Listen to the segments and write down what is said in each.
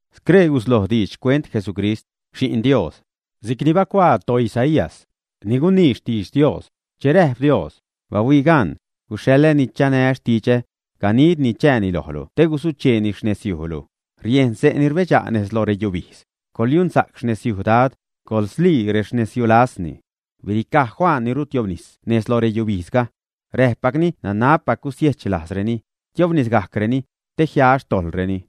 Scree gusloj diidx xcuent Jesucrist, Xi'n Dios. Si'cni bacuaa toIsaías, ni gunii xtidx Dios, che räjp Dios: Bahuii gan, guxhaḻä ni chanä xtidxä, ganidni chääni lojlu te guzucheeni xnezyujlu. Riejn xse' ni rbedxa' nez loj reyubijdz: “Coḻyunsa'c xnezyuj Dad, coḻslii rexnezyulajzni.” Biricaj Juan ni rutiobnis nez loj reyubijdzga. Räpgajcni nanabpac gusiechlajzreni, tiobnisgajcreni, te jia xtojḻreni.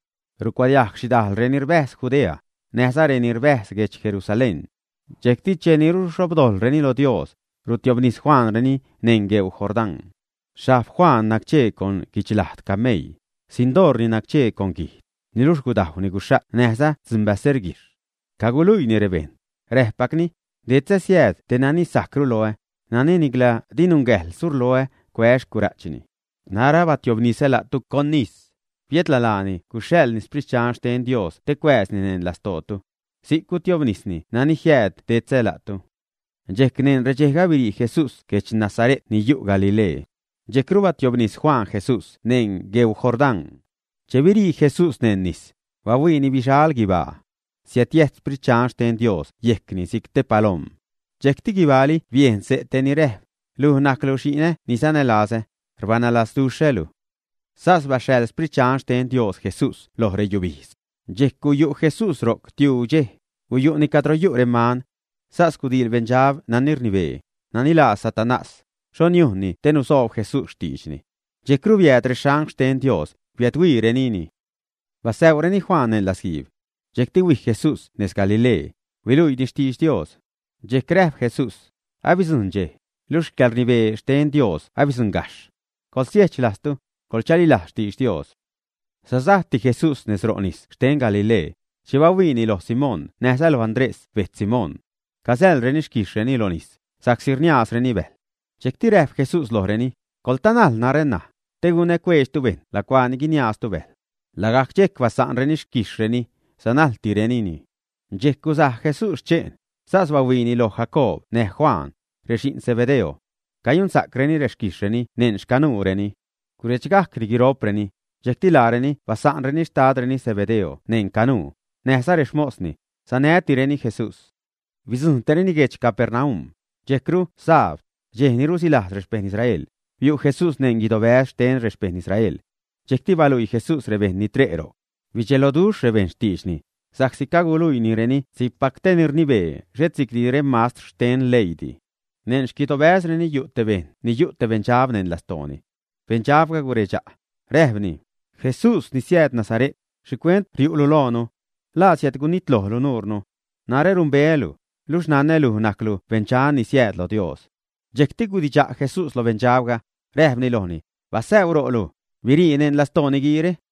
Riädcuadiajg xhidajl reni rbäjz Judea, näjza reni rbäjz guedx Jerusalén. Dxejcti cheni ruxhobdojḻreni lo Dios, rustiobnis Juanreni neṉ gueu Jordán. Xhajb Juan nacchee con guichlajd cameii, xsindoorni nacchee con guijd, niluxh gudajwni guxha't näjza dzunbäserguijxh. Caguluiini rebejṉ, räpgajcni: ―Detzä siääd tej nani sajcru loä, nani nicla di nungäjḻ surloä, cuää́ xcura'chni. Narä abatiobnisä la'tu con nis, biädla laani guxhaḻni Sprit Dxan xten Dios te cuääzni neṉ lastootu. Si'c gustiobnis nani jiääd detzä la'tu. Dxejc, neṉ redxejga, birii Jesús guedx Nasare't ni yu' Galilee. Dxejcru batiobnis Juan Jesús neṉ gueu Jordán. Che birii Jesús neṉ nis, bahuiini bixal guibaa. siädyäjt Sprit Dxan xten Dios yejcni si'c te palom. Dxejcti guibaali biejn xse' te ni räjp: ―Luj najclu xi'nä ni sanälazä; rbanälazduxhälu. Sas baxhaḻ Sprit Dxan xten Dios Jesús lo reyubijdz. Dxejc guyu' Jesús ro'c tiuu dxej, guyu'ni cadro yu' reman. Sas gudiil beṉdxab nani rnibee, nani laa Satanás, xho niujnni te nusoob Jesús xtiidxni. Dxejcru biääd reangl xten Dios, biädhuiirenini. Basäḻreni Juan neṉ latzguiib. Dxejcti huij Jesús nez Galilee, huiluiini xtidx Dios. Dxejc räjp Jesús: ―Abidzujṉ dxej, luxh yäḻrnibee xten Dios abidzujṉ gajxh. Coḻsiejch lajztu, coḻchalilajz xtidx Dios. Sasajti Jesús nez ro' nis xten Galilee, che bahuiini lo Simón näjza loj Andrés bejtz Simón. Cazäḻreni xquijxhreni lo nis, sa'csi rniaazreni bäjl. Dxejc räjp Jesús lojreni: ―Coḻtanajl narä, te gunä cueedxtu bejṉ lacuaa ni guiniaaztu bäjl. Lagajc dxejc basa'nreni rexquijxhreni, sanätirenini. Dxejc gusaj Jesús sche'n, sas bahuiini loj Jacoob näj Juan, rexi'n Zebedeo. Cayunsa'creni xquijxhreni neṉ xcanuureni. Guredxgajcni guiro'preni, dxejcti laareni basa'nreni xtadreni Zebedeo neṉ canuu, näjza rexmosni, sanätireni Jesús. Bidzujṉtireni guedx Capernaum. Dxejcru sabd, dxej ni rusilajz rexpeṉ Israel, biu' Jesús neṉ guidobäz xten rexpeṉ Israel. Dxejcti baluii Jesús rebejṉ ni tre' ro'c. Bidxelojni rebejṉ xtiidxni, sa'csi caguluiinireni si'cpac te ni rnibee, xhet si'cdi remastr xten leiidi. Neṉ xquidobäzreni yu' te bejṉ yu' te beṉdxab neṉ lastooni. Beṉdxabga guredxa', räjpni: ―Jesús, ni siääd Nazare't, ¿xhicuent riu'lu loonu? ¿La siädgunitlojlu nuunu? Narä numbeälu, luxh nanä luj najclu beṉdxan ni siääd lo Dios. Dxejcti gudidxa' Jesús lo beṉdxabga, räjpni lojni: ―Basäuu ro'lu, birii neṉ lastoo niguiire.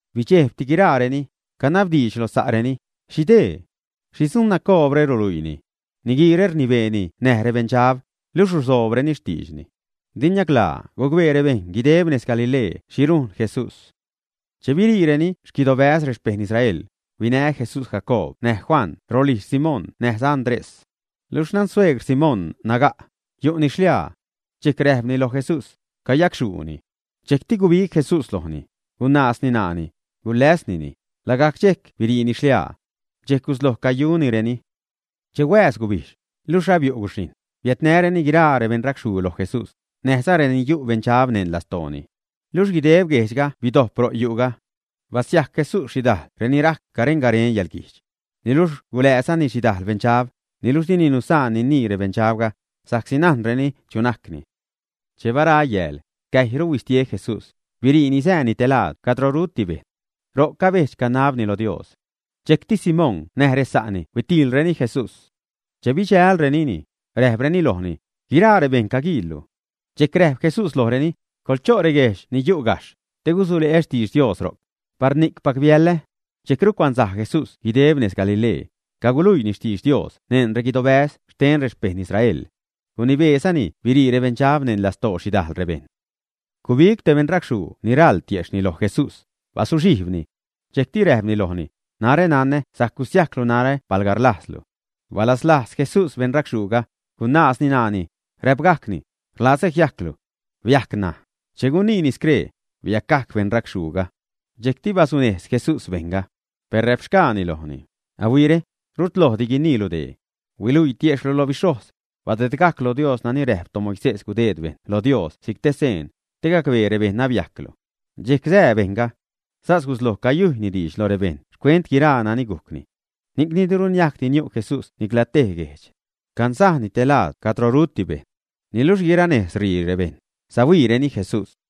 Bidxejbti guiraareni, canabdiidx loj sa'reni: ―¿Xhi dee? ¿Xhi dzuun nacoobre ruluiini? Niguiire rnibeeni näj rebeṉdxab, luxh ruzoobreni xtiidxni. Di niaclaa gucbee rebejṉ guideb nez Galilee xhi rujn Jesús. Che biriireni xquiidobäz rexpejṉ Israel, huinä Jesús Jacoob näj Juan rolijz Simón näjza Andrés. Luxh xnan suegr Simón naga', yu'ni xliaa. Dxejc räjpreni lo Jesús: ―Cayacxhuuni. Dxejcti gubig Jesús lojni, gunaazni ṉaani, guläsnini; lagajc dxejc biriini xliaa. Dxejc gusloj cayunireni. Che huääz gubijdx, luxh abiu' guxhijṉ, biädnäreni guiraa rebeṉracxhuu loj Jesús, näjza renani yu' beṉdxab neṉ lastooni. Luxh guideb guejdxga bidojp ro' yu'ga. Basiajc Jesús xhidajl renani rajc garen-garen yäḻguijdx. Niluxh gulääzani xhidajl beṉdxab, niluxh dini nusaan ninii rebeṉdxabga, sa'csi najnreni chu najcni. Che bara yääl, cäjyru bistie Jesús, biriini sääni te laad cadro ruti bejṉ. Ro'c cabejdx-canabni loj Dios. Dxejcti Simón näj resa'ni huitiilreni Jesús. Che bidxälrenini, räjpreni lojni: ―Guiraa rebejṉ caguiillu. Dxejc räjp Jesús lojreni: ―Coḻcho' reguejdx ni yu' gajxh, te gusuleä xtidx Dios ro'c. Par ni'cpac biäḻä. Dxejcru cuansaj Jesús guideb nez Galilee, caguluiini xtidx Dios neṉ reguidobäz xten rexpejṉ Israel. Gunibeezani birii rebeṉdxab neṉ lastoo xhidajl rebejṉ. Gubig te beṉracxhuu ni raḻ tiejxhni loj Jesús, bazuxhijbni. Dxejcti räjpni lojni: ―Narä nanä sajc gusiajclu narä palga rlajzlu. Balaslajz Jesús beṉracxhuuga, gunaazni ṉaani, räpgajcni: ―Rlazä jiajclu. Biajc ṉaj. Cheni guniini scree, biacgajc beṉracxhuuga. Dxejcti gulunejz Jesús bejṉga. Per räpxgaani lojni: ―Ahuiire, rutlojdi guiniilu dee. Huiluii tiejxhlu lo bixhojz. Badedgajc lo Dios nani räjp toMoisés gudeed bejṉ lo Dios si'c te seen, te gacbee rebejṉ abiajclu. Dxejc sää bejṉga. Sas gusloj cayujyni diidx lo rebejṉ xcuent guiraa nani gujcni. Ni'cni diru niajcdi niu' Jesús nicla tej guejdx. Cansajni te laad cadro ruti bejṉ. Niluxh guiranejz ṟii rebejṉ, siädhuiireni Jesús.